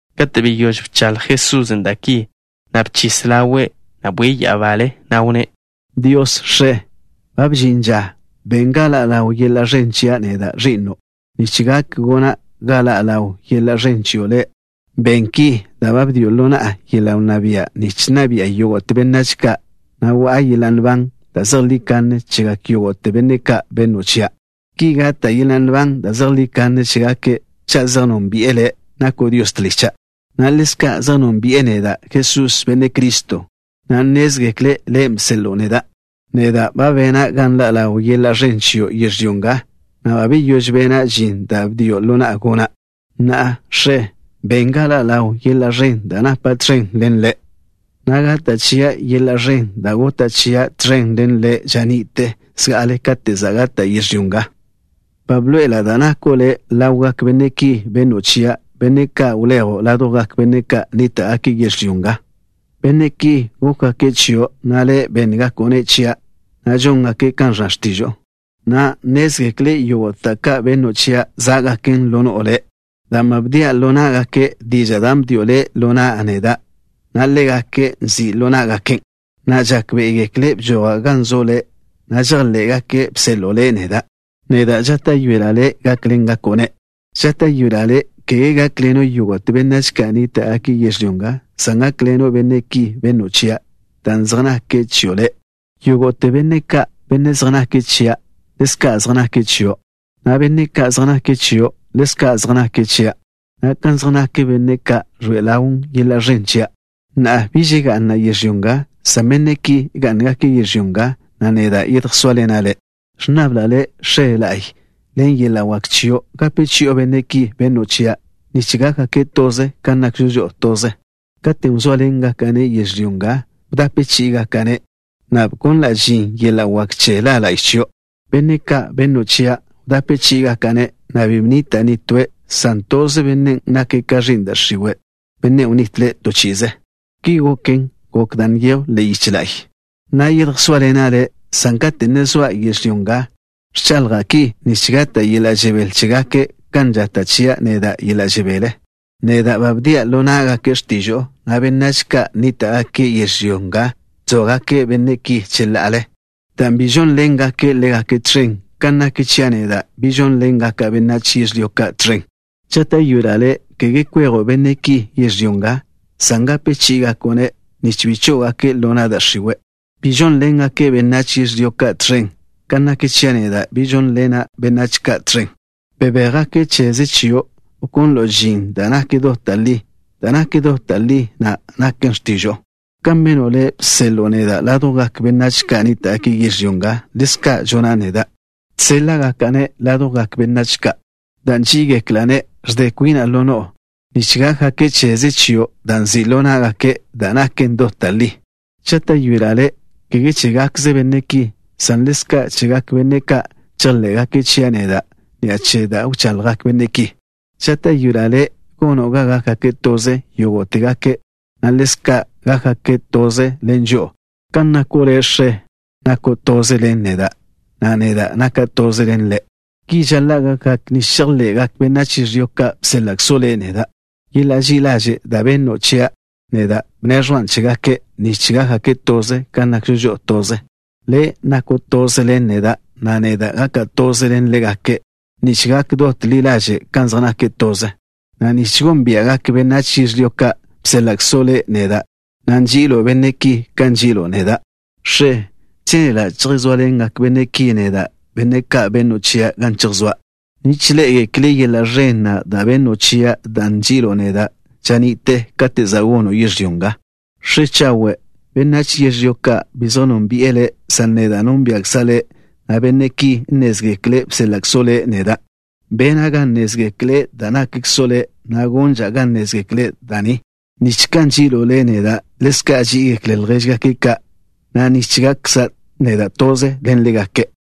Kate' beyóž bchaḻj Jesusen' da' ki, bchis ḻawe', na' bwie' ya'abale, na' wnné': —Dios, X̱e, ba bžin ža. Ben ga ḻa' ḻaw yeḻa' ẕen chia' neda', Ẕi'no', nich gak gona' ga ḻa' ḻaw yeḻa' ẕen chio' Le'. Ben ki dan' ba bdio' ḻo na'a yeḻa' wnná bia' nich nna bi'a yógo'te benách ka', na' wa'a yeḻa' nban da' zejlí kanne chegak yógo'te benne' ka' benno' chia'. Ki gata' yeḻa' nban da' zejlí kanne chégake', cha' zej nónbi'e Le', nako' Dios tlicha', na' ḻezka' zej nónbi'e neda', Jesús, Benne' Criston', na' nnézgekle' Le' bseḻo'o neda'. ’Neda' ba bena' ga nḻa' ḻaw yeḻa' ẕen chio' yežlyó nga, na' ba beyóž bena' žin da' bdio' ḻo na'a gona'. Na'a, X̱e, ben ga ḻa' ḻaw yeḻa' ẕen da' napa' tẕen ḻen Le', na' gata' chia' yeḻa' ẕen' da' gota' chia' tẕen ḻen Le' ža ni'te zga'ale kate' gota' yežlyó nga. ’Ba bḻoe'ela' da' nako' Le' ḻawgak benne' ki benno' chia', benne' ka' wlejo' ládjwgak benách ka' nníta'gake' yežlyó nga. Benne' ki gókgake' chio', na' Le' bénngako'-ne' chia', na' žóngake' kan ẕnna x̱tižo'o. Na'a nnézgekle' yógo'te da' ka' benno' chia' zá'gaken ḻo no'o Le', dan' ba bdia' ḻo ná'gake' dižan' da' bdio' Le' ḻo na'a neda', na' ḻégake' nzi' ḻo ná'gaken', na' žákbe'egekle' bžoja' gan zo' Le', na' žejḻé'gake' bseḻo'o Le' neda'. ’Neda' žáta'yoela' Le' gákḻengako'-ne'. Žáta'yoela' Le', kege gákḻeno' yógo'te benách ka' nníta'gake' yežlyó nga, san gákḻeno' benne' ki benno' chia', dan' zej nake' chio' Le'. Yógo'te benne' ka', benne' zej nake' chia', ḻezka' zej nake' chio', na' benne' ka' zej nake' chio' ḻezka' zej nake' chia', na' kan zej nak benne' ka' ẕloe'e ḻawn yeḻa' ẕen chia'. ’Na'a, biž ga'na' yežlyó nga, san benne' ki gá'ngake' yežlyó nga, na' neda' yedjsóaḻena' Le'. Ẕnnabla' Le', X̱e la'y, ḻen yeḻa' wak chio' gape chi'o benne' ki benno' chia', nich gákgake' toze, kan nakžo žo'o toze. Katen' wzóaḻengaka'-ne' ḻo yežlyó nga, wdape chí'igaka'-ne', na' bkonla' žin yeḻa' wak che La la'y chio'. Benne' ka' benno' chia', wdape chí'igaka'-ne', na' bi bnita' nitóe', san toze bennen' nake' ka ẕi'n da' x̱iwe', bennen' wnitle' to chi'ize. Ki goken, gok da' nyejw ḻe'e yiche la'y. ’Na'a yedjsóaḻena' Le', san kate' ne zoa' yežlyó nga, ẕchaḻja' ki nich gata' yeḻa' žebél chégake' kan žata' chia' neda' yeḻa' žebél. Neda' ba bdia' ḻo ná'gake' x̱tižo'o, na' benách ka' nníta'gake' yežlyó nga ẕzóagake' benne' ki cheḻa'ale dan' bi žónḻengake' ḻégake' tẕen, kan nak chia' neda', bi žónḻena' benách yežlyó ka' tẕen. Žáta'yoela' Le', kege kwejo' benne' ki yežlyó nga, san gape chí'igako'-ne', nich bi chó'ogake' ḻo na' da' x̱iwe'. Bi žónḻengake' benách yežlyó ka' tẕen, kan nak chia' neda', bi žónḻena' benách ka' tẕen. Bebéj-gake' cheze chio', wkonlo' žin da' nak dot da' li. Da' nak dot da' li na' naken x̱tižo'o. Kan beno' Le', bseḻo'o neda' ládjwgak benách ka' nníta'gake' yežlyó nga, ḻezka' žona' neda', žséḻa'gaka'-ne' ládjwgak benách ka'. Dan' nží'igekla'-ne' ẕde kwina' ḻo no'o, nich gákgake' cheze chio' dan' nzi' ḻo ná'gake' da' naken dot da' li. ’Žáta'yoela' Le', kege chégakze benne' ki, san ḻezka' chegak benne' ka' chejḻé'gake' chia' neda' ni'a che da' wchaḻjgak benne' ki. Žáta'yoela' Le' gono' ga gákgake' toze yógo'tegake', na' ḻezka' gákgake' toze ḻen žo'o, kan nako' Le', X̱e, nako' toze ḻen neda', na' neda' naka' toze ḻen Le'. Ki žaḻa' gákgake' nich chejḻe'gak benách yežlyó ka', bséḻa'kzo' Le' neda'. Yeḻa' ži'i ḻažen' da' benno' chia', neda' bneẕjwan' chégake', nich gákgake' toze, kan nakžo žo'o toze. Le' nako' toze ḻen neda', na' neda' gaka' toze ḻen ḻégake', nich gak dot ḻi ḻaže' kan zej nake' toze, na' nich gónbia'gak benách yežlyó ka', bséḻa'kzo' Le' neda', na' nži'ilo' benne' ki kan nži'ilo' neda'. ’X̱e, žénela' yedjsóaḻengak benne' ki neda', benne' ka' benno' chia', gan chejsóa', nich ḻé'egekle' yeḻa' ẕen na' da' benno' chia' dan' nži'ilo' neda' ža ni'te, katen' za' gono' yežlyó nga. X̱e chawe', benách yežlyó ka' bi zej nónbi'e Le', san neda' nónbia'kza' Le', na' benne' ki nnézgekle' bséḻa'kzo' Le' neda'. Bena' ga nnézgekle' da' nakkzo' Le', na' gonža' ga nnézgekle' da' ni, nich kan nži'ilo' Le' neda', ḻezka' ží'igekle' ljéžgake' ka', na' nich gakkza' neda' toze ḻen ḻégake'.